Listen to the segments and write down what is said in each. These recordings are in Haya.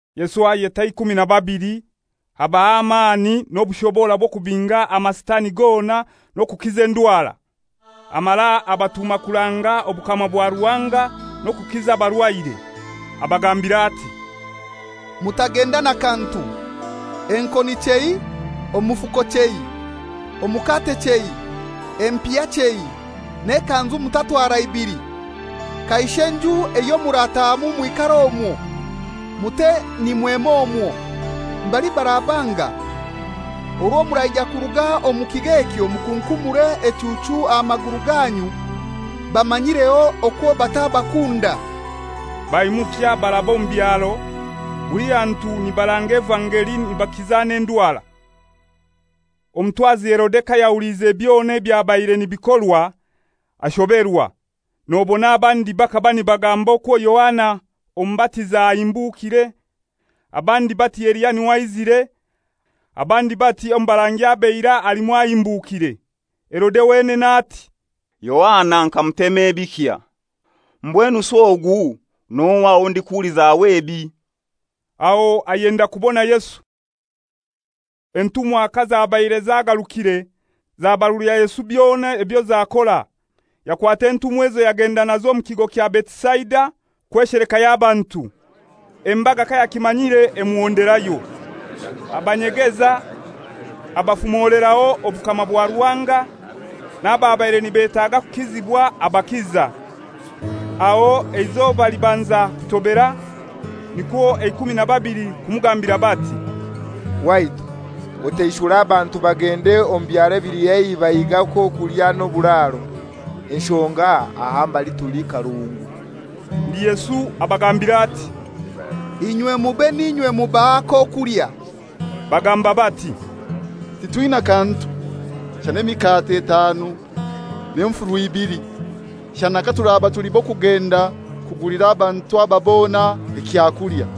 Yesu ayeta eikumi na babili, abaha amani n'obushobora bw'okubinga amasitani gona n'okukiza endwara. Amara abatuma kuranga obukama bwa Ruhanga n'okukiza abarwaire. Abagambira ati, «Mutagenda na kantu: Enkoni chei, omufuko chei, omukate chei, empiha chei, n'ekanzu mutatwara ibili. Kaishe nju eyo muratahamu mwikare omwo, mute nimwema omwo. Mbali barabanga, orwo muraija kuruga omu kigo ekyo mukunkumure echuuchu aha maguru ganyu bamanyireho okwo batabakunda.» Baimukya baraba omu byaro, buli hantu nibaranga evangeli nibakiza n'endwara. Omutwazi Herode kayahuliize byona ebyabaire nibikorwa, ashoberwa. Nobona abandi bakaba nibagamba okwo Yohana omubatiza ahimbukire, abandi bati Eliya n'iwe aizire, abandi bati omu barangi ab'eirai alimu ahimbukire. Herode wenene ati, «Yohana nkamutema ebikya; mbwenusi ogu n'ohai owo ndikuhulizaho ebi?» Aho ayenda kubona Yesu. Entumwa kazabaire zagarukire, zabarulira Yesu byona ebyo zakora. Yakwata entumwa ezo yagenda nazo omu kigo kya Betisaida kweshelekayo abantu. Embaga kayakimanyire emuhonderayo. Abanyegeza, abafumoleraho obukama bwa Ruhanga, n'ababaire nibetaga kukizibwa abakiza. Aho eizoba libanza kutobera, nikwo eikumi na babili kumugambira bati, «Waitu, otaishure abantu bagende omu byaro ebili haihi bahige ak'okulya n'oburaaro; enshonga aha mbali tuli karungu.» Ndi Yesu abagambira ati, «Inywe mube n'inywe mubaha ak'okulya.» Bagamba bati, «Titwina kantu, shana emikate etanu n'enfuru ibili, shana katuraba tuli b'okugenda kugulira abantu aba bona ekyakulya.»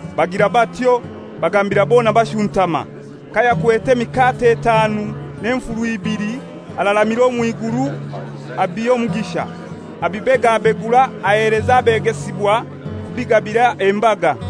Bagira batyo, bagambira bona bashuntama. Kayakwete emikate etanu n'enfuru ibili araramira omw'iguru, abiha omugisha, abibegabegura aheleza abegesibwa kubigabira embaga.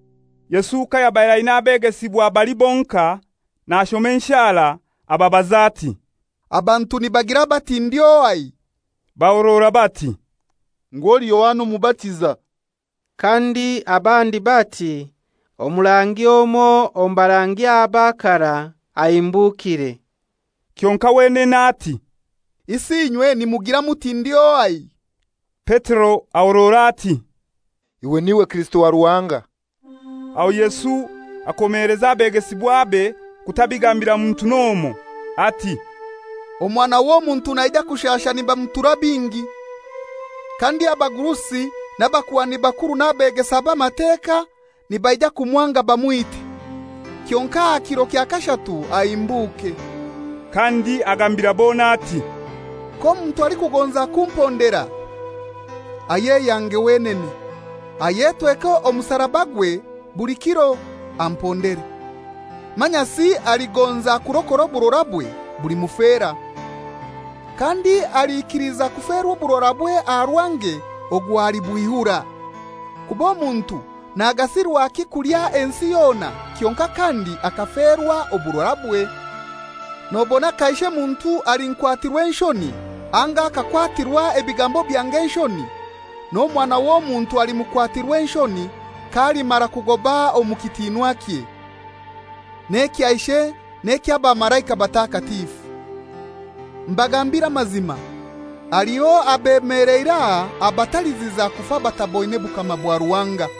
Yesu kayabaire aina abegesibwa bali bonkai, nashoma enshara, ababaza ati, «Abantu nibagira bati ndi ohai?» Bahorora bati, «Ngu oli Yohana Omubatiza; kandi abandi bati Omurangi omoi omu barangi aba karai ahimbukire.» Kyonkai wenene ati, «Isi inywe nimugira muti ndi ohai?» Petero ahorora ati, «Iwe n'iwe Kirisito wa Ruhanga.» Aho Yesu akomeleza abegesibwabe kutabigambira muntu n'omoi, ati, «Omwana w'Omuntu naija kushasha nibamutura bingi, kandi abagurusi n'abakuhani bakuru n'abeegesa b'Amateka nibaija kumwanga bamwite, kyonkai aha kiro kya kashatu ahimbuke.» Kandi agambira bona ati, «K'omuntu alikugonza kumpondera, ayeyange wenene, ayetweke omusarabagwe buli kiro, ampondere. Manyasi aligonza kurokora oburorabwe bulimufera, kandi alikiliza kuferwa oburorabwe aha rwange ogwo alibwihura. Kuba Omuntu nagasirwaki kulya ensi yona kyonkai kandi akaferwa oburorabwe? Nobona kaishe muntu alinkwatirwa enshoni anga akakwatirwa ebigambo byange enshoni, n'Omwana w'Omuntu alimukwatirwa enshoni k'alimara kugoba omu kitinwakye n'ekya Ishe n'eky'abamalaika batakatifu. Mbagambire amazima, haliho abemeleire aha abataliziza kufa bataboine bukama bwa Ruhanga.»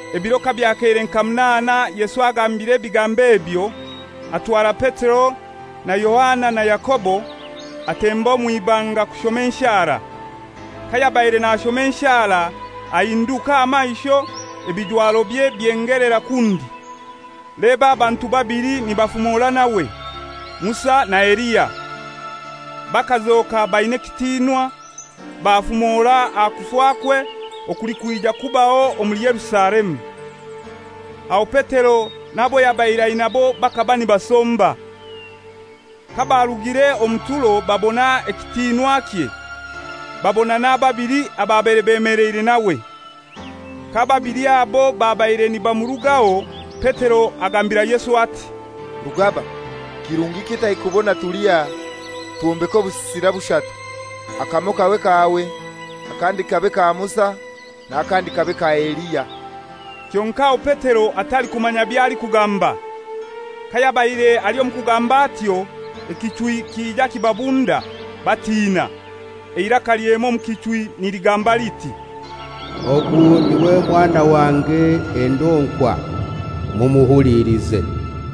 Ebiro kabyakeire nka munaana Yesu agambire ebigambo ebyo, atwara Petero na Yohana na Yakobo, atemba omw'ibanga kushoma enshara. Kayabaire nashoma enshara ahinduka aha maisho, ebijwarobye byengelera kundi. Leba abantu babili nibafumora nawe: Musa na Eliya. Bakazoka baina ekitinwa, bafumora aha kufakwe okulikwija kubaho omuli Yerusalemu. Aho Petero n'abo yabaire ainabo bakaba nibasomba. Kabarugire omu turo babona ekitinwakye, babona n'ababili ababaire bemeleire nawe. K'ababili abo babaire nibamurugaho, Petero agambira Yesu ati, «Rugaba, kirungi kitai kubona tuli aha! Twombeke obusisira bushatu, akamoi kabe kawe, akandi kabe ka Musa n'akandi kabe ka Eliya,» kyonkai aho Petero atalikumanya by'alikugamba. Kayabaire ali omu kugamba atyo, ekichwi kija kibabunda, batina. Eiraka lyema omu kichwi niligamba liti, «Ogu n'iwe Mwana wange endonkwa, mumuhulilize!»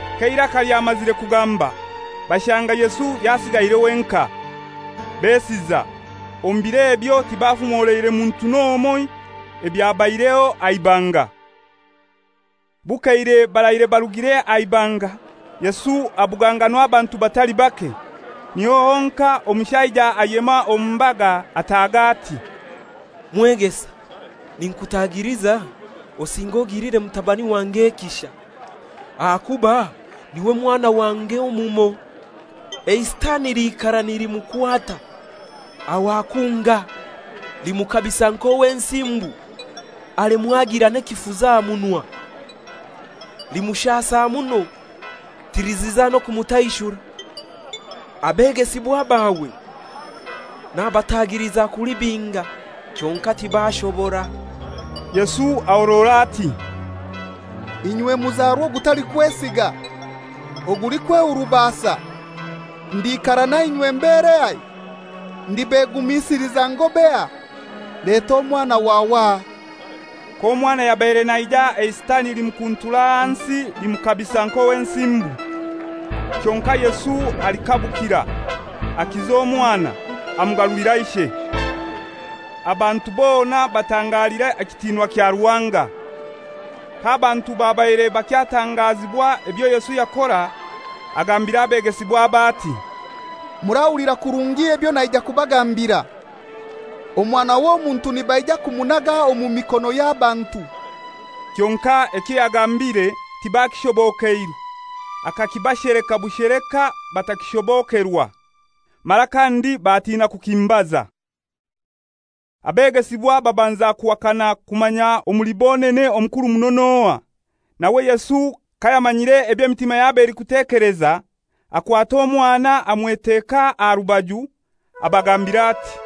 K'eiraka lyamazire kugamba, bashanga Yesu yasigaire wenkai. Besiza, omu bir'ebyo tibafumoleire muntu n'omoi ebyabaireho aha ibanga. Bukeire baraire barugire aha ibanga, Yesu abuganganwa abantu batali bake. Niho honkai omushaija ayema omu mbaga ataaga ati, «Mwegesa, ninkutagiliza osinge ogilire mutabani wange ekisha, ahakuba n'iwe mwana wange omumoi. Eisitani liikara nilimukwata, aho akunga. Limukabisa nk'owensimbu alemwa agira n'ekifuzi aha munwa. Limushaasa muno tiliziza na kumutaishura. Abegesibwa bawe nabatagiliza kulibinga, kyonkai tibaashobora.» Yesu ahorora ati, «Inywe muzarwa ogutalikwesiga, ogulikwehurubasa, ndikara nainywe mberehai? Ndibegumisiliza ngobehai? Leta omwana wawe aha!» K'omwana yabaire naija eisitani limukuntura ahansi limukabisa nk'owensimbu. Kyonkai Yesu alikabukira, akiza omwana, amugarulira ishe. Abantu bona batangalira ekitinwa kya Ruhanga. K'abantu babaire bakyatangazibwa ebyo Yesu yakora, agambira abegesibwabe ati, «Murahulira kurungi ebyo naija kubagambira. Omwana w'Omuntu nibaija kumunaga omu mikono y'abantu.» Kyonkai ekyo yagambire tibakishobokeirwe, akakibasheleka busheleka batakishobokerwa. Mara kandi batiina kukimubaza. Abegesibwa babanza kuhakana kumanya omuli bonene omukuru muno n'ohai. Nawe Yesu kayamanyire eby'emitima yabo elikutekeleza, akwata omwana amweteka aha rubaju, abagambira ati,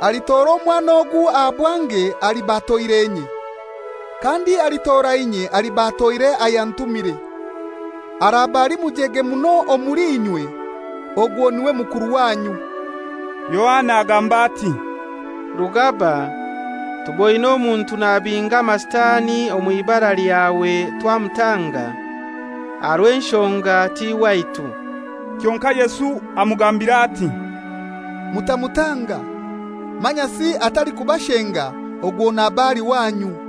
«Alitora omwana ogu aha bwange aliba atoire inye. Kandi alitora inye aliba atoire ayantumire. Araba ali mujege muno omuli inywe, ogwo n'iwe mukuru wanyu.» Yohana agamba ati, «Rugaba, tuboine omuntu nabinga amasitani omw'ibara lyawe twamutanga, aha rw'enshonga ti waitu.» Kyonkai Yesu amugambira ati, «Mutamutanga, manyasi atalikubashenga ogwo naba ali wanyu.»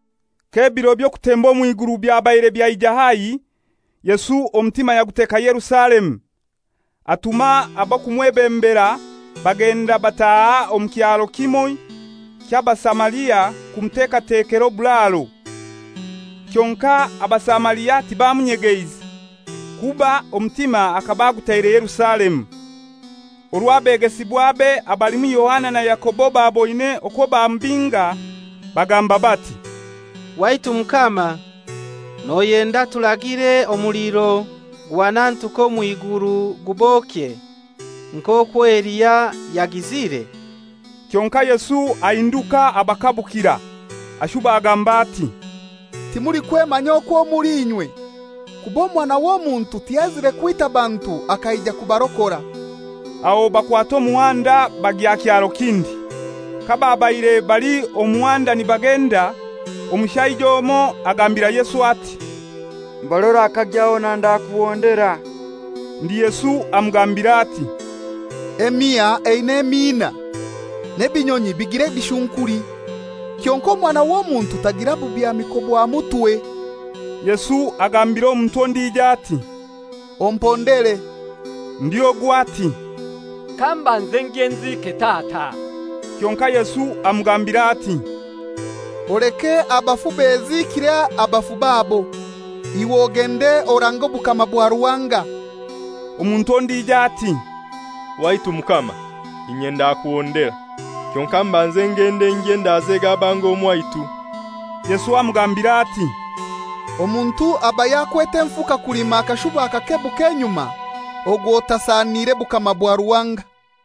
K'ebiro by'okutemba omw'iguru byabaire byaija haihi, Yesu omutima yaguteka Yerusalemu. Atuma ab'okumwebembera, bagenda bataha omu kyaro kimoi ky'Abasamaria kumuteekatekera oburaaro. Kyonkai Abasamaria tibamunyegeize, kuba omutima akaba agutaire Yerusalemu. Orwo abegesibwabe, abalimu Yakobo na Yohana baboine okwo bamubinga, bagamba bati, «Waitu Mukama, noyenda turagire omuliro guhanantuke omw'iguru gubokye; [nk'okwo Eliya yagizire?]» Kyonkai Yesu ahinduka abakabukira. [Ashuba agamba ati, «Timulikwemanya kwo muli inywe, kuba Omwana w'Omuntu tiyaizire kwita bantu akaija kubarokora.»] Aho bakwata omuhanda bagya kyaro kindi. Kababaire bali omu muhanda nibagenda, omushaija omoi agambira Yesu ati, «Mbali orakagya hona ndakuhondera.» Ndi Yesu amugambira ati, «Emiha eina emiina, n'ebinyonyi bigira ebishunkuli. Kyonkai Omwana w'Omuntu tagira bubyamiko bwa mutwe.» Yesu agambira omuntu ondijo ati, «Ompondere.» Ndi ogu ati, «Kambanze ngye nziike tata.» Kyonkai Yesu amugambira ati, «Oleke abafu beziikire abafu babo. Iwe ogende orange obukama bwa Ruhanga.» Omuntu ondijo ati, «Waitu Mukama, inye ndakuhondera; kyonkai mbanze ngende ngye ndazege abange omwaitu.» Yesu amugambira ati, «Omuntu aba yakwete enfuka kulima akashuba akakebuka enyuma ogwo tasanire bukama bwa Ruhanga.»